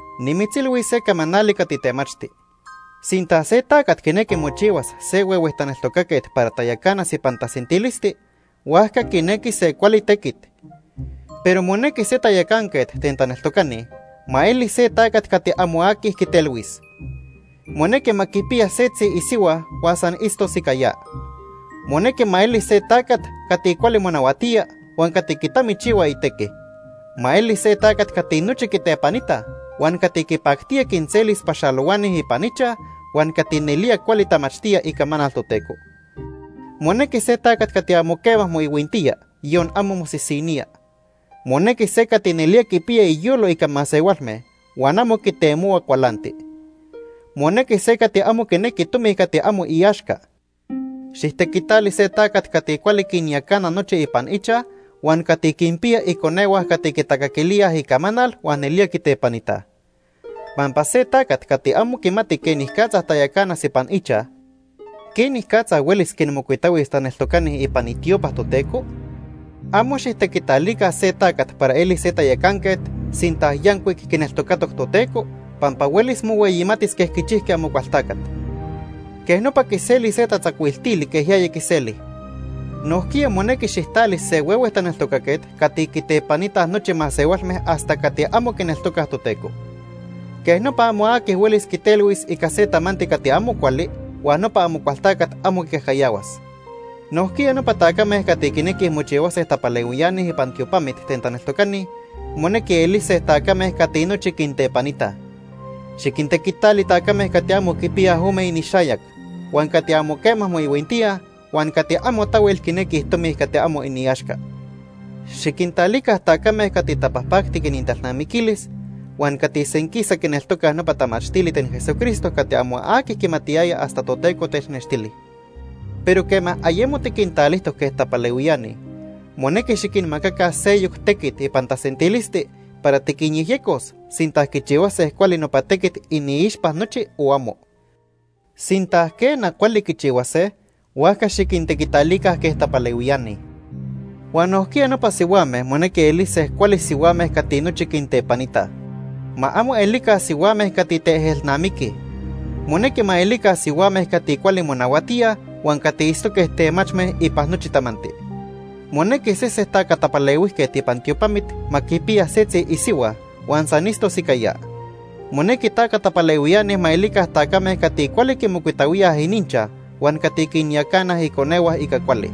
Nimitzilhuis se camanali cati temachti. Sinta se tacat quinequi mochihuas se huehue taneltocaquet para tayacanas ipan tasentilisti, huajca quinequi se cuali tequit. Pero monequi se tayacanquet ten taneltocani ma eli se tacat cati amo aqui quitelhuis. Monequi ma quipiya setzi isihua huan san itztos ica ya. Monequi ma eli se tacat cati cuali monahuatía huan cati quitamichihua itequi. Ma eli se tacat cati nochi quitepanitaj, huan cati quipactía quinselis paxalohuani ipan ichaj huan cati nelía cuali tamachtía icamanal Toteco. Monequi se tacat cati amo quema moihuintía, yon amo mosisinía. Monequi se cati nelía quipiya iyolo ica masehualme huan amo quitemohua cualanti. Monequi se cati amo quinequi tomi cati amo iaxca. Xijtequitali se tacat cati cuali quinyacana nochi ipan ichaj huan cati quinpiya iconehua cati quitacaquilía icamanal huan nelía quitepanitaj. Pampa se tacat cati amo quimati quenicatza tayacanas ipan ichaj, ¿quenicatza huelis quinmocuitahuis taneltocani ipan itiopa Toteco? Amo xijtequitalica se tacat para elis se tayacanquet sinta yancuic quineltocatoc Toteco, pampa huelis mohueyimatis quej quichijqui Amocualtacat. Quej nopa quiselis se tatzacuiltili quej yaya quiseli. Nojquiya monequi xijtali se huehue taneltocaquet cati quitepanitaj nochi masehualme hasta cati amo quineltocaj Toteco. Quej nopa amo aqui huelis quitelhuis ica se tamanti cati amo cuali huan nopa Amocualtacat amo quicajcayahuas. Nojquiya nopa tacame cati quinequij mochihuase tapalehuiani ipan tiopamit ten taneltocani monequi elise tacame cati nochi quintepanitaj. Xiquintequitali tacame cati amo quipiyaj ome inixayac, huan cati amo quema moihuintíaj huan cati amo tahuel quinequij tomi cati amo iaxca. Xiquintalica tacame cati tapajpactic inintalnamiquilis huan cati senquisa quineltocaj nopa tamachtili ten Jesucristo cati amo aqui quimatiyaya hasta Toteco technextili. Pero quema ayemo tiquintalijtoc quej tapalehuiani, monequi xiquinmacaca seyoc tequit ipan tasentilisti para tiquinyejyecos sinta quichihuase cuali nopa tequit iniixpa nochi o amo. Sinta, quena, cuali quichihuase, huajca xiquintequitalica quej tapalehuiani. Huan nojquiya nopa sihuame monequi elise cuali sihuame cati nochi quintepanitaj. Ma amo elica sihuame cati teejelnamiquij. Monequi ma elica sihuame cati cuali monahuatíaj huan cati itztoque temachme ipan nochi tamanti. Monequi sese taca tapalehuijquet ipan tiopamit ma quipiya setzi isihua huan san itztos ica ya. Monequi taca tapalehuiani ma elica tacame cati cuali quimocuitahuíaj ininchaj huan cati quinyacana iconehua ica cuali.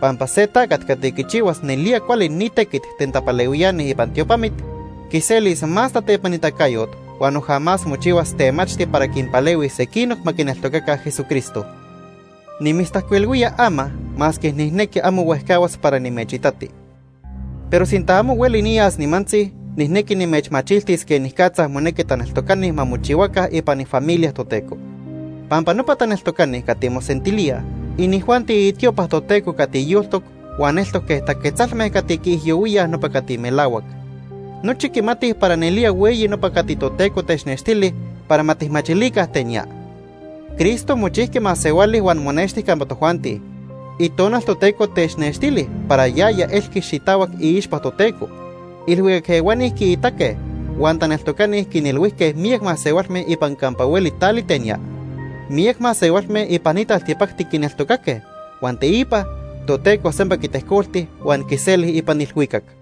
Pampa se tacat cati quichihuas nelía cuali ni tequit ten tapalehuiani ipan tiopamit, quiselis más tatepanitacayot huan noja más mochihuas temachti para quinpalehuis sequinoc ma quineltocaca Jesucristo. Nimitztajcuilhuía ama masque nijnequi amo huejcahuas para nimechitati. Pero sinta amo hueli niyas nimantzi, nijnequi nimechmachiltis quenicatza monequi taneltocani ma mochihuaca ipan ifamilia Toteco. Pampa nopa taneltocani cati mosentilíaj, inijuanti itiopa Toteco cati yoltoc huan eltoc quej taquetzalme cati quiijyohuíaj nopa cati melahuac. Nochi quimatij para nelía hueyi nopa cati Toteco technextili para ma tijmachilica ten ya: Cristo mochijqui masehuali huan monexti campa tojuanti. Itonal Toteco technextili para yaya elqui xitahuac iixpa Toteco. Ilhuicac ehuani quiitaque. Huan taneltocani quinilhuijque miyac masehualme ipan campa hueli tali ten ya. Miyac masehualme ipan ni taltipacti quineltocaque. Huan teipa Toteco sempa quitejcolti huan quiseli ipan ilhuicac.